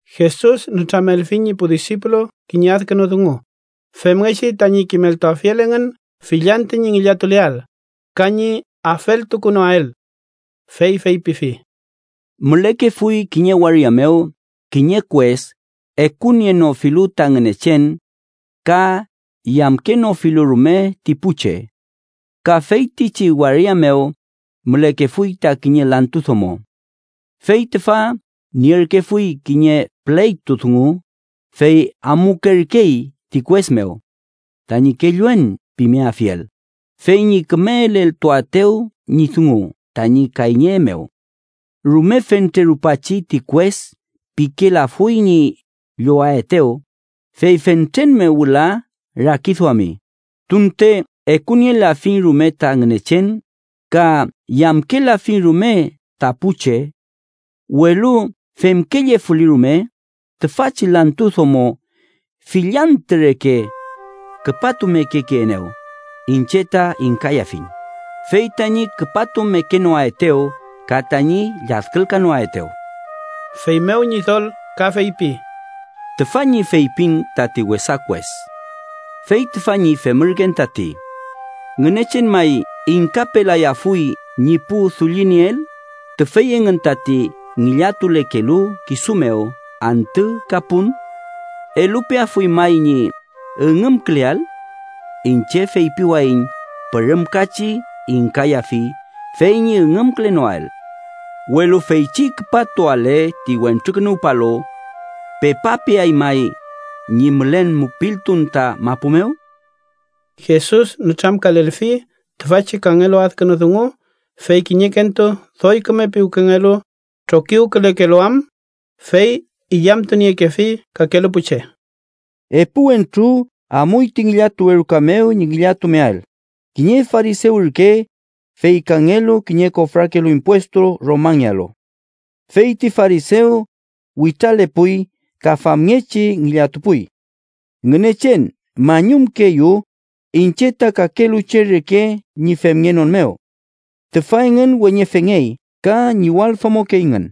Jesus nütramelfi ñi pu disipulu kiñe adkünu dungu femngechi tañi kimeltuafiel engün fill antü ñi ngillatuleael, ka ñi afeltukunoael. Fey feypifi: “Mülekefuy kiñe waria mew kiñe kues ekunienofulu ta Ngünechen ka yamkenofilu rume ti pu che. Ka feytichi waria mew mülekefuy ta kiñe lantu domo. Fey tüfa nierkefuy kiñe pleytu dungu, fey amukerkey ti kues mew tañi ‘kelluen’ pimeafiel fey ñi küme eleltuaetew ñi dungu tañi kayñe mew. Rume fentre rupachi ti kues pikelafuy ñi llowaetew, fey fentren mew wüla rakiduami: ‘tunte ekunielafiñ rume ta Ngünechen ka yamkelafiñ rume ta pu che. Welu femkellefuli rume, tüfachi lantu domo fill antü reke küpatumekekeenew, iñche ta ingkayafiñ, fey tañi küpatumekenoaetew ka tañi lladkülkanoaetew.’” Feymew Ñidol ka feypi: “Tüfa ñi feypin tati wesa kues. Fey tüfa ñi femürken tati ¿Ngünechen may ingkapelayafuy ñi pu dullinieel, tüfey engün tati ngillatulekelu kisu mew antü ka pun? ¿Elupeafuy may ñi üngümküleael? Iñche feypiwayiñ pürümkachi ingkayafi fey ñi üngümkülenoael. Welu feychi küpatuale ti Wentrukünuwpalu ¿pepapeay may ñi mülen mupiltun ta mapu mew?” Jesus nütramkalelfi tüfachi kangelu adkünu dungu fey kiñekentu doy küme piwkengelu trokiwkülekelu am, fey illamtuniekefi kakelu pu che: “Epu wentru amuy ti ngillatuwe ruka mew ñi ngillatumeael, kiñe farisew ürke, fey kangelu kiñe kofrakelu impuestu Romangealu. Fey ti farisew, witralepuy ka famngechi ngillatupuy: ‘Ngünechen mañumkeeyu, iñche ta kakelu che reke ñi femngenon mew. Tüfa engün weñefengey ka ñiwaldomokeyngün.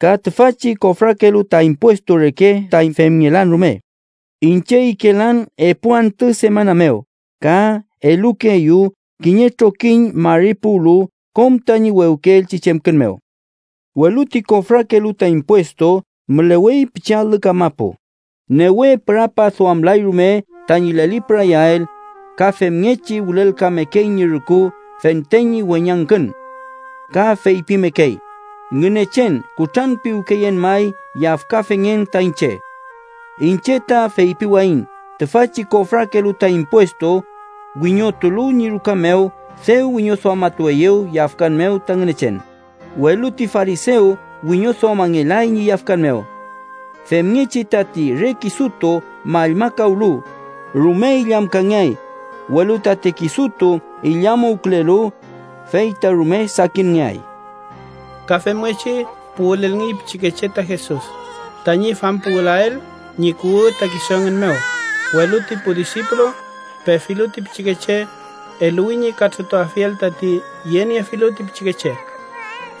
Ka tüfachi kofrakelu ta impuestu reke ta femngelan rume. Iñche ikelan epu antü semana mew ka elukeeyu kiñe trokiñ mari puwlu kom tañi wewkeelchi chemkün mew.’ “Welu ti kofrakelu ta impuestu mülewey pichi alü kamapu, newe pürapaduamlay rume tañi lelipürayael, ka femngechi wülelkamekey ñi rüku fente ñi weñangkün. Ka feypimekey: ‘¡Ngünechen kutranpiwkeen may, yafkafengen ta iñche!’ “Iñche ta feypiwayiñ tüfachi kofrakelu ta impuestu, wiñotulu ñi ruka mew, dew wiñoduamatueyew yafkan mew ta Ngünechen, welu ti farisew wiñoduamangelay ñi yafkan mew. Femngechi tati re kisutu mallmakawlu, rume illamkangeay, welu tati kisutu illamuwkülelu, fey ta rume sakinngeay.” Ka femngechi puwülelngey pichikeche ta Jesus, tañi fampuwülael ñi kuwü ta kisu engün mew, welu ti pu disipulu, pefilu ti pichikeche, eluwi ñi katrütuafiel tati yeniefilu ti pichikeche.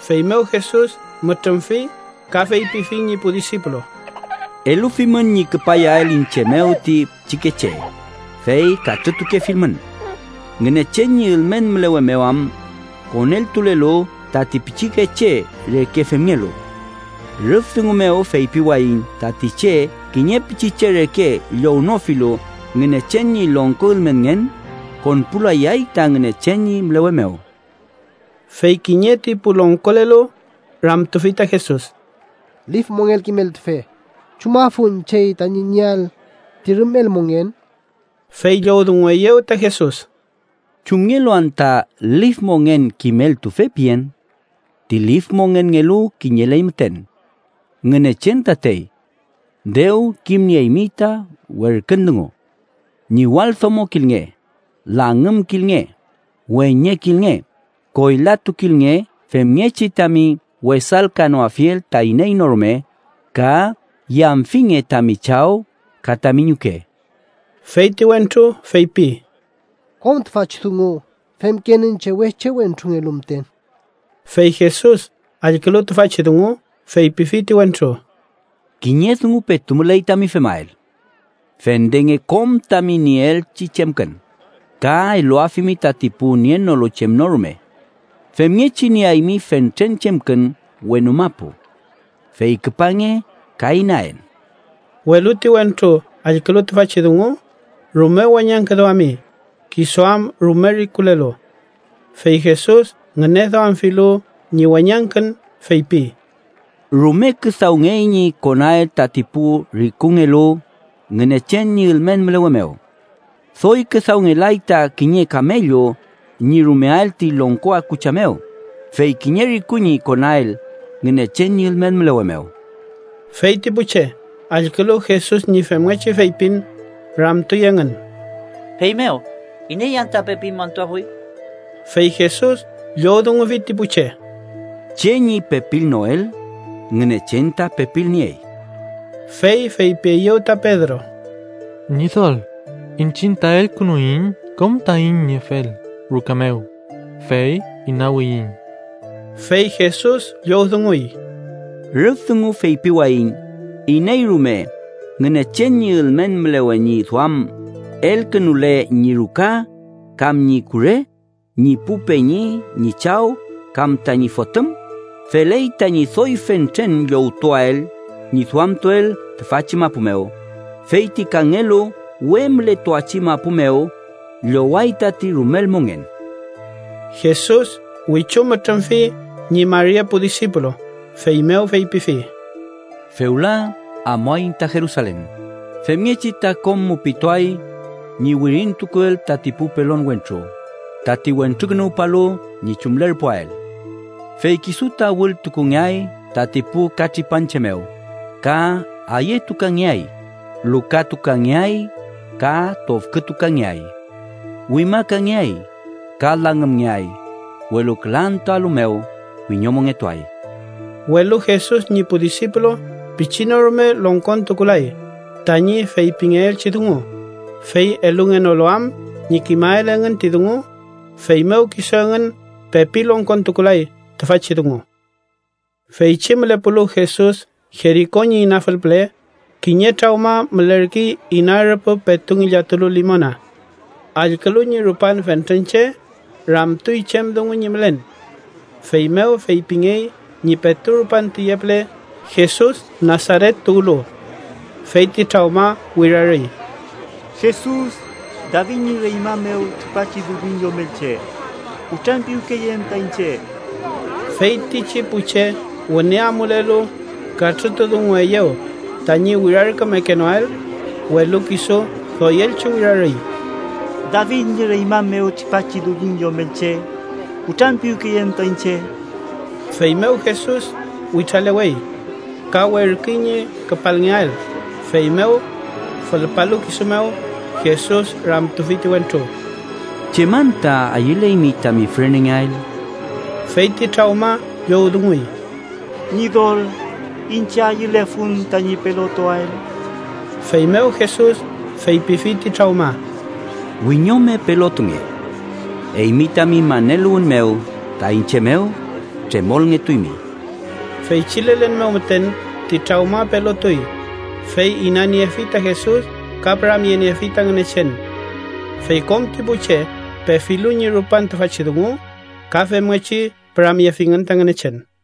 Feymew Jesus mütrümfi ka feypifi ñi pu disipulu: —Elufimün ñi küpayael iñche mew ti pichikeche, fey katrütukefilmün. Ngünechen ñi ülmen mülewe mew am koneltulelu tati pichikeche reke femngelu. Rüf dungu mew feypiwayiñ tati che kiñe pichiche reke llownofilu Ngünechen ñi longko ülmenngen, konpulayay ta Ngünechen ñi mülewe mew. Fey kiñe ti pu longkolelu ramtufi ta Jesus: —Lif mongen kimeltufe, ¿chumafun chey tañi nieael ti rumel mongen? Fey llowdungueyew ta Jesus: —¿Chumngelu anta Lif mongen kimeltufe pien? Ti lif mongenngelu kiñeley müten: Ngünechen tatey. Dew kimnieymi ta werkün dungu: ‘Ñiwaldomokilnge, langümkilnge, weñekilnge, koylatukilnge femngechi tami wesalkanoafiel ta iney no rume, ka yamfinge tami chaw ka tami ñuke.’ Fey ti wentru feypi: —Kom tüfachi dungu femken iñche weche wentrungelu müten. Fey Jesus, allkülu tüfachi dungu, feypifi ti wentru: —Kiñe dungu petu müley tami femael: fendenge kom tami nieelchi chemkün, ka eluafimi tati pu nienolu chem no rume. Femngechi nieaymi fentren chemkün wenu mapu. Fey küpange ka inaen. Welu ti wentru allkülu tüfachi dungu, rume weñangküduami, kisu am rume rikulelu. Fey Jesus ngüneduamfilu ñi weñangkün, feypi: —¡Rume küdawngey ñi konael tati pu rikungelu Ngünechen ñi ülmen mülewe mew! Doy küdawngelay ta kiñe kamellu ñi rumeael ti longko akucha mew, fey kiñe riku ñi konael Ngünechen ñi ülmen mülewe mew. Fey ti pu che, allkülu Jesus ñi femngechi feypin, ramtuy engün: —Feymew ¿iney anta pepi montuafuy? Fey Jesus llowdungufi ti pu che: —Che ñi pepilnoel, Ngünechen ta pepilniey. Fey feypieyew ta Pedro: —Ñidol, iñchiñ ta elkünuiñ kom taiñ niefel ruka mew, fey inawiyiñ. Fey Jesus llowdunguy: —Rüf dungu feypiwayiñ iney rume, Ngünechen ñi ülmen mülewe ñi duam, elkünule ñi ruka, kam ñi kure, ñi pu peñi, ñi chaw kam tañi fotüm, feley tañi doy fentren llowtuael ñi duamtuel tüfachi mapu mew, fey ti kangelu we mületuachi mapu mew, lloway tati rumel mongen. Jesus wichu mütrümfi ñi mari epu disipulu, feymew feypifi: “Fewla amuaiñ ta Jerusalen, femngechi ta kom mupituay ñi wirintukuel tati pu pelon wentru, tati Wentrukünuwpalu ñi chumlerpuael. Fey kisu ta wültukungeay tati pu katripanche mew, ka ayetukangeay, lukatukangeay ka tofkütukangeay. Wimakangeay ka langümngeay, welu küla antüalu mew wiñomongetuay.” Welu Jesus ñi pu disipulu pichi no rume longkontukulay tañi feypingeelchi dungu, fey elungenolu am ñi kimael engün ti dungu, feymew kisu engün pepi longkontukulay tüfachi dungu. Feychi mülepulu Jesus Jeriko ñi inafül püle, kiñe trawma mülerkey ina rüpü petu ngillatulu limona. Allkülu ñi rupan fentren che, ramtuy chem dungu ñi mülen. Feymew feypingey ñi petu rupan tüye püle Jesus Nasaret tuwlu. Fey ti trawma wirarüy: —¡Jesus, David ñi reñma mew tripachi Dullin Yomelche, kutranpiwkeyeen ta iñche! Feytichi pu che wüne amulelu katrütudungueyew tañi wirarkümekenoael, welu kisu doyelchi wirarüy. —¡David ñi reñma mew tripachi Dullin Yomelche, kutranpiwkeyeen ta iñche! Feymew Jesus witralewey ka werküy ñi küpalngeael, feymew fülpalu kisu mew, Jesus ramtufi ti wentru: —¿Chem anta ayüleymi tami fürenengeael? Fey ti trawma llowdunguy: —Ñidol, iñche ayülefun tañi pelotuael. Feymew Jesus feypifi ti trawma: —¡Wiñome pelotunge! Eymi tami maneluwün mew ta iñche mew, tremolngetuymi. Feychi lelen mew müten ti trawma pelotuy, fey inaniefi ta Jesus ka püramyeniefi ta Ngünechen. Fey kom ti pu che pefilu ñi rupan tüfachi dungu, ka femngechi püramyefingün ta Ngünechen.